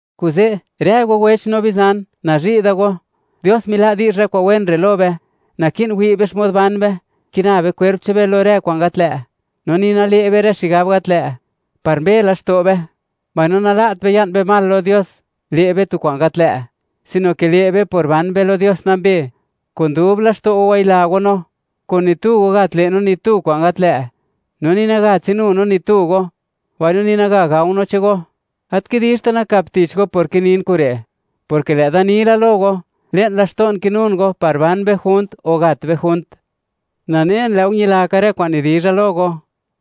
Kuze', rë go wech no bizan, nazhi' da go, Dios mila' di'zh rë kwa'n wen re' lo be, naki'n wi' be xmod ban be, kina be kwerp che'n be lo rë kwa'n gat lë', no ni nale' be rë xigab gat lë', par mbe laxto' be, mbaino nala't be ya'n be mal lo Dios, le' be tu kwa'n gat lë', sino ke le' be por ban be lo Dios nambe. Kun dub laxto' go, wayila go no. Kun ni tu go gat le' no ni tu kwa'n gat lë', no ni naga tsinu no ni tu go, mbaino ni naga gao no chego. Gat kidizhta' nakap tich go por kinin kure', porke lë'da ni la lo go, le'n laxto'n kinun go, par ban be junt o gat be junt. Nanen lë' go ñilaka rë kwa'n nidizha lo go,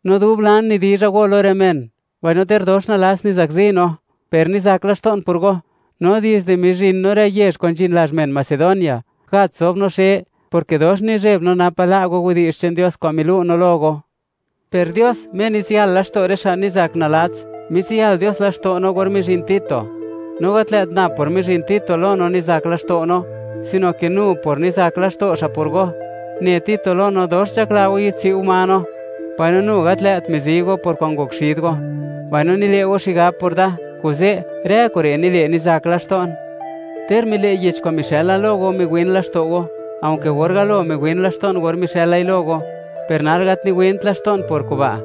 no dub lan nidizha go lo rë men, mbaino ter dox nalats nizakzi no, per nizak laxto'n por go. No dizde mizhin no rë yezh kwa'n nzhin lazh men Macedonia, gat zob no xe, porke dox nizheb no, napa' la' go widi'zh che'n Dios kwa'n milu' no lo go. Per Dios, Me nitsiyal laxto' rë xa' nizak nalats, mitsiyal Dios laxto' no or mizhin Tito. No gat lë't nab por mizhin Tito lo no nizak laxto' no, sino ke nu por nizak laxto' xa' por go. Ne Tito lo no, dox nzhakla go yidtswi' go ma no, mbaino nu gat lë't mizi go por kwa'n ngok xid go, mbaino nile' go xigab por da. Kuze' rë kure' nile' nizak laxto'n. Ter mile' yech kwa'n mixë'la lo go miwin laxto' go, aunke gor galo miwin laxto'n gor mixë'lai lo go, per nal gat niwint laxto'n por kuba',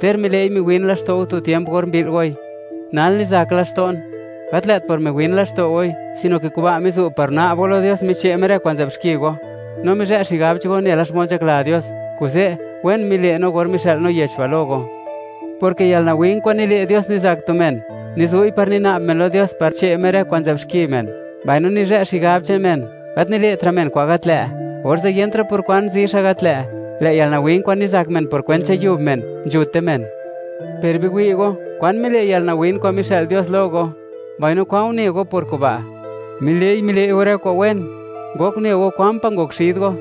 ter mile'i miwin laxto' go tu tiemp or mbi'l goi. Nal nizak laxto'n, gat lë't por miwin laxto' goi, sino ke kuba' mizu' par una'b go lo Dios miche' Me rë kwa'n nzë'b xki go, no mizhë' xigab che'n go nela xmod nzhakla Dios. Kuze', wen mile' no gor mixë'l no yech ba' lo go, porke yalnawin kwa'n nile' Dios nizak tu men, nizu'i par nina'b men lo Dios par che' Me rë kwa'n nzë'b xki men, mbaino nizhë' xigab che'n men, gat nile'tra' men kwa'n gat lë', orze' yentra' por kwan zi xa' gat lë'. Lë' yalnawin kwa'n nizak men por kwent che'n yub men, nzhute men. Per biwi' go, kwan mile' yalnawin kwa'n mixë'l Dios lo go, mbaino kwan une go por kuba': ¡Mile'i, mile' go rë kwa'n wen!: ngok une go, kwan pa' ngok xid go;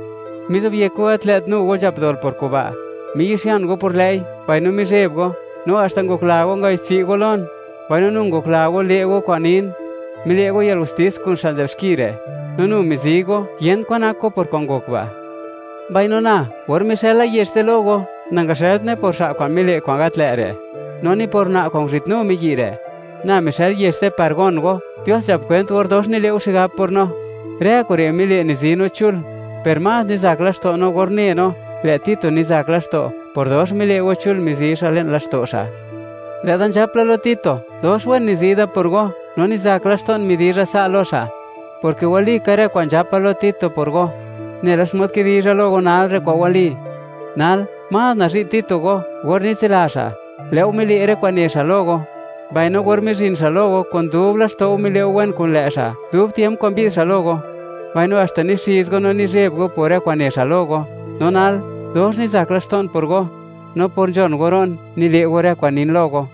mizobyek go gat lë't nu go nzhap dol por kuba'; miyi'xian go por lë'i, mbaino mizheb go, no haxta ngokla go ngayi'dtsi' go lon, mbaino nu ngokla go le' go kwa'n nin. Mile' go yalgustis kun xa' nzë'b xki re', no nu mizi go, yent kwa'n nak go por kwa'n ngok ba'. Mbaino na, or mixëla yech ze' lo go, nangaxë'ltne por xa' kwa'n mile' kwa'n gat lë' re', no ni por una' kwa'n nguzhitnu miyi' re'. Na mixël yech ze' par gon go, Dios nzhap kwent or dox mile' go xigab por no. Rë kure' mile', nizi no chul, per más nizak laxto' no or une no, lë' Tito nizak laxto', por dox mile' go chul mizi xa' le'n laxto' xa'. Lë'da nzhap la lo Tito, dox wen nizi da por go, no nizak laxto'n midizha sa' lo xa', porke walika rë kwa'n nzhapa lo Tito por go, nela xmod kidizha lo go nal re' kwa'n wali. Nal, más nazhi' Tito go, or nitsila xa', lë' go mile' rë kwa'n ne xa' lo go, mbaino or mizhin xa' lo go, kun dub laxto' go mile' go wen kun lë' xa', dub tiemp kwa'n mbi'd xa' lo go; mbaino haxta nixiz go no mizheb go por rë kwa'n ne xa' lo go. No nal, dox nizak laxto'n por go, no por nzhon go ro'n, nile' go rë kwa'n nin lo go.